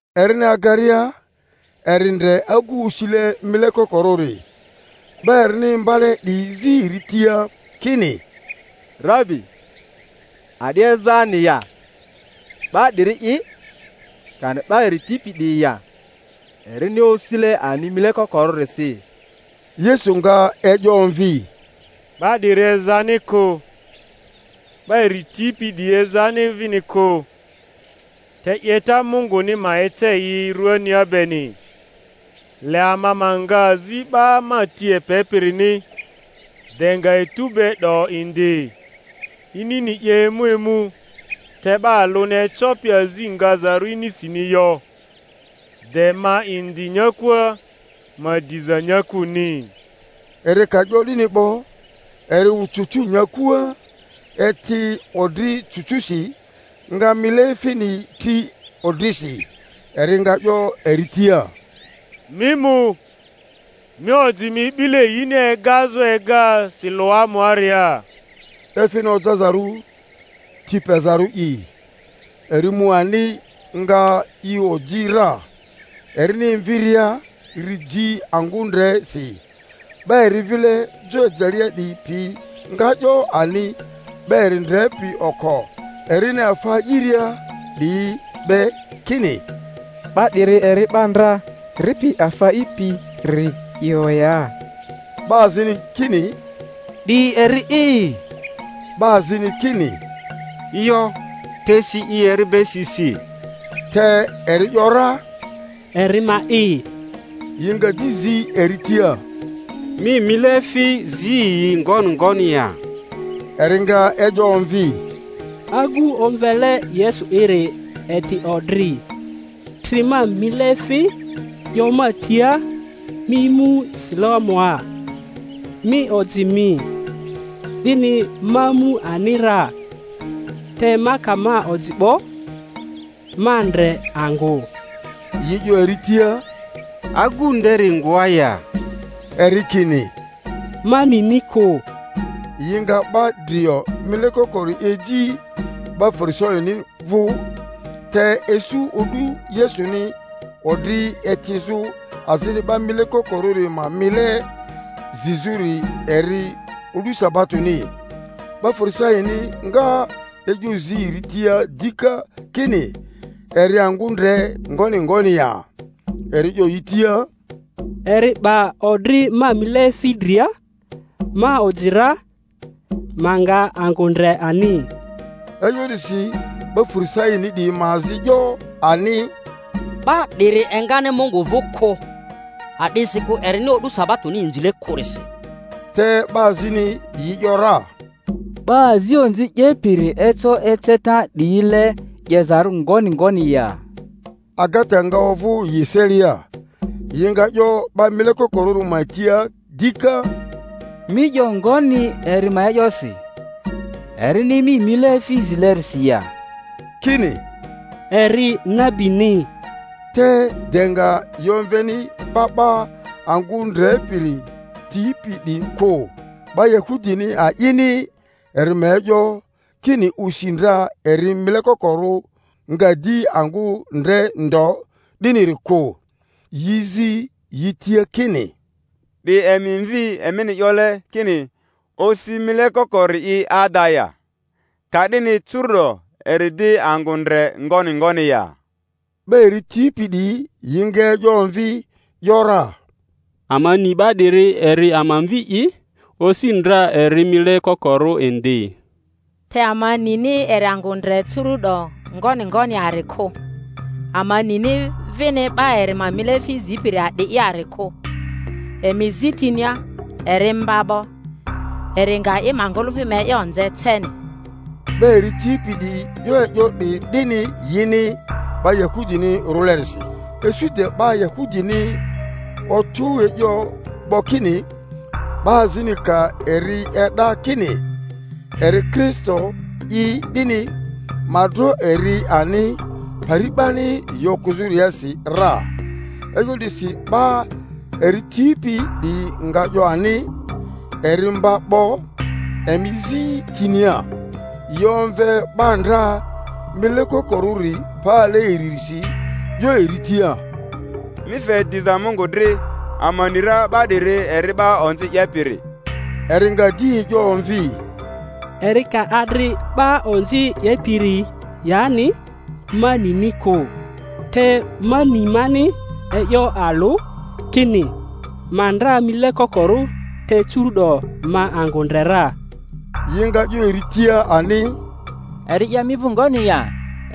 Erini agaria, eri ndre agu osile mile kokorᴜri. 'Ba erini imba-le 'diyi zi eri tia kini, Rabi, a'di ezani ya, 'ba 'diri'i, kani 'ba eri tipi 'diyi ya, erini osile ani mile kokorᴜrisi? Yesu nga e'yo omvi, Ba 'diri ezani kᴜ, 'ba eri tipi 'diyi ezani vini kᴜ, te 'yeta Munguni ma ece yi ruania beni. Le ama ma nga azi 'ba ma ti epepirini, de nga etu be 'do indi; inini 'ye emu emu, te 'ba alᴜni ecopi azi ngazaru inisini yo. De ma indi nyakua, ma diza nyakuni. Eri ka 'yo 'dini 'bo, eri wᴜ cucu nyakua, eti odri cucusi, nga mileefini tri odrisi, eri nga 'yo eri tia, Mi mu, mi oji mi 'bile yini egazᴜ ega Siloamuaria (efini ojazarᴜ Ti Pezarᴜ'i). Eri mu ani, nga i oji ra, erini emviria ri ji angᴜ ndre si. 'Ba eri vile jo ejelea 'diyi pi nga 'yo ani 'ba eri ndrepi oko erini afa a'iria 'diyi be, kini, 'Ba 'diri eri 'ba ndra ripi afa a'ipiri yo ya? 'Ba azini kini, 'Di eri'i; 'ba azini kini, Yo, te si i eri be si si. Te eri ‘yora, Eri ma'i. Yi nga di zi eri tia, Mi mileefi zi yi ngoni ngoni ya? Eri nga e'yo omvi, Agu omvele Yesu'iri eti odri, tri ma mileefi, 'yo ma tia, Mi mu Siloamua, mi oji mi; 'dini ma mu ani ra, te ma ka ma oji 'bo, ma ndre angᴜ. Yi 'yo eri tia, Agᴜ nderi ngoa ya? Eri kini, Ma nini kᴜ. Yi nga 'ba drio mile kokori eji 'ba Farisaini vᴜ. Te isu o'du Yesuni odri etizᴜ azini 'ba mile kokorᴜri ma mile zizᴜri eri o'du sabatoni. 'Ba Farisani nga e'yo zi eri ria dika kini eri angᴜ ndre ngoni ngoni ya. Eri 'yo yi tia, Eri 'ba odri ma mileefi dria, ma oji ra, ma nga angᴜ ndre ani. E'yo 'disi 'ba Farisaini 'diyi ma azi 'yo ani, 'Ba 'diri eri engani Mungu vᴜ kᴜ, a'disikᴜ erini o'du sabatoni inzile kᴜrisi. Te 'ba azini yi ‘yora, 'Ba azi onzi 'yepiri eco eceta 'diyile 'yezarᴜ ngoni ngoni ya? Agata nga ovᴜ yi eselia. Yi nga 'yo 'ba mile kokorᴜri ma tia dika, Mi 'yo ngoni eri ma e'yosi, erini mi mileefi zilerisi ya? Kini, Eri nabini. Te de nga yi omveni 'ba 'ba angᴜ ndrepiri tipi 'diyi kᴜ, 'ba Yahudini a'ini eri ma e'yo, kini osi ndra eri mile kokorᴜ, nga di angᴜ ndre ndo, 'diniri kᴜ; yi zi yi tia kini, 'Di emi mvi, emini 'yole kini osi mile kokori'i ada ya? Ka'dini curu'do eri di angᴜ ndre ngoni ngoni ya? 'Ba eri tipi 'diyi yi nga e'yo omvi ‘yora, Ama ni 'ba 'diri eri ama mvi'i, osi ndra eri mile kokorᴜ indi; te ama nini eri angᴜ ndre curu’do ngoni ngoni yari kᴜ, ama nini vini 'ba eri ma mileefi zipiri a'di'i yari kᴜ. Emi zi tinia; eri mba 'bo, eri nga i ma ngᴜlᴜpi ma e'yo nze ceni. 'Ba eri tipi 'diyi 'yo e'yo 'diyi 'dini yini 'ba Yahudini rᴜlerisi; isu de 'ba Yahudini otᴜ e'yo 'bo kini, 'ba azini ka eri e'da kini eri Kristo'i 'dini, ma dro eri ani pari 'bani yi okᴜzᴜriasi ra. E'yo 'disi 'ba eri tipi 'diyi nga 'yo ani, Eri mba 'bo; emi zi tinia. Yi omve 'ba ndra mile kokorᴜri pale iririsi, 'yo eri tia, Mi fe diza Mungᴜ dri; ama ni ra 'ba 'diri eri 'ba onzi 'yepiri. Eri nga di e'yo omvi, Eri ka adri 'ba onzi 'yepiri yani ma nini ku; te ma ni mani e'yo alᴜ, kini, ma ndra mile kokorᴜ te curu'do ma angᴜ ndre ra. Yi nga 'yo eri tia ani, Eri 'ye mi vᴜ ngoni ya?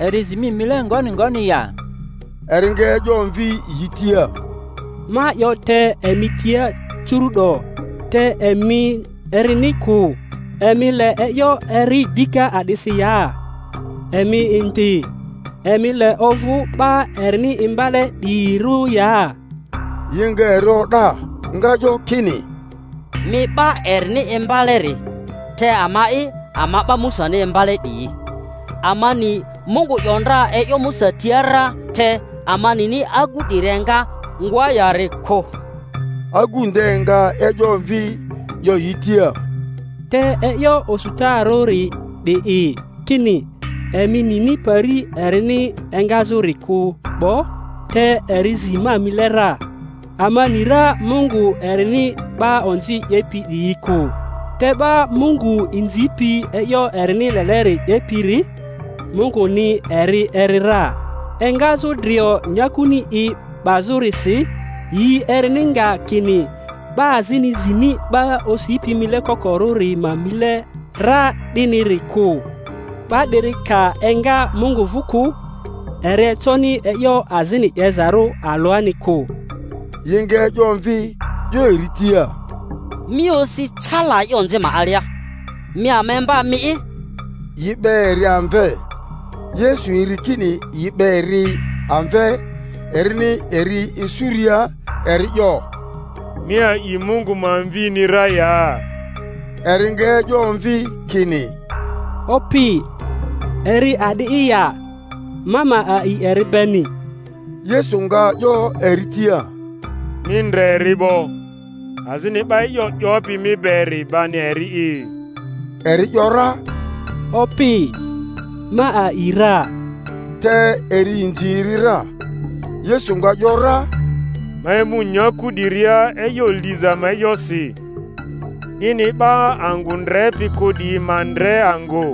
Eri zi mi mile ngoni ngoni ya? Eri nga e'yo omvi yi tia, Ma 'yo te emi tia curu'do, te emi erini kᴜ. Emi le e'yo eri dika a'disi ya? Emi indi, emi le ovᴜ 'ba erini imbale 'diyirᴜ ya? Yi nga eri o'da, nga 'yo kini, Mi 'ba erini imbaleri, te ama'i, ama 'ba Musani imbale 'diyi. Ama ni Mungᴜ 'yo ndra e'yo Musa tia ra, te ama nini agᴜ 'diri enga ngoa yari kᴜ. Agu nde nga e'yo omvi 'yo yi tia, Te e'yo osutarᴜri 'di'i, kini emi nini pari erini engazᴜri kᴜ 'bo, te eri zi ma mile ra. Ama ni ra Mungᴜ erini 'ba onzi 'yepi 'diyi kᴜ, te 'ba Mungu inzipi e'yo erini leleri 'yepiri, Mungᴜni eri eri ra. Enga-zᴜ drio nyakuni i 'bazᴜrisi yi erini nga kini 'ba azini zini 'ba osipi mile kokorᴜri ma mile ra 'diniri kᴜ. 'Ba 'diri ka enga Mungu vᴜ kᴜ, eri econi e'yo azini 'yezarᴜ alᴜani kᴜ. Yi nga e'yo omvi 'yo eri tia, Mi osi cala e'yo onzi ma alia, mi ama imba mi'i? Yi 'be eri amve. Yesu eri kini yi 'be eri amve; erini eri isuria, eri 'yo, Mi a'i Mungu ma Mvini ra ya? Eri nga e'yo omvi kini, Opi, eri a'di'i ya, ma ma a'i eri beni? Yesu nga 'yo eri tia, Mi ndre eri 'bo, azini 'ba e'yo 'yopi mi beri bani eri'i. Eri ‘yora, Opi, ma a'i ra; te eri inzi eri ra. Yesu nga ‘yora, Ma emu nyaku 'diria e'yo liza ma e'yosi, 'dini 'ba angᴜ ndrepi kᴜ 'diyi ma ndre angᴜ,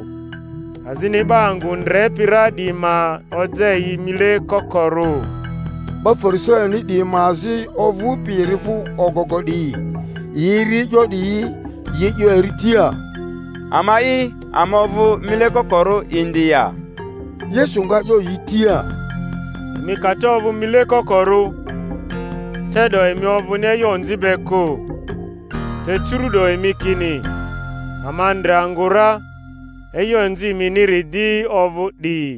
azini 'ba angᴜ ndrepi ra 'diyi ma oja yi mile kokorᴜ. 'Ba Farisaini 'diyi ma azi ovᴜpi eri vᴜ ogogo 'diyi, yi eri e'yo 'diyi, yi 'yo eri tia, Ama'i, ama ovᴜ mile kokorᴜ indi ya? Yesu nga 'yo yi tia, Emi ka te ovᴜ mile kokorᴜ, te'do emi ovᴜni e'yo onzi be kᴜ; te curu’do emi kini, Ama ndre angᴜ ra; e'yo onzi eminiri di ovᴜ 'di.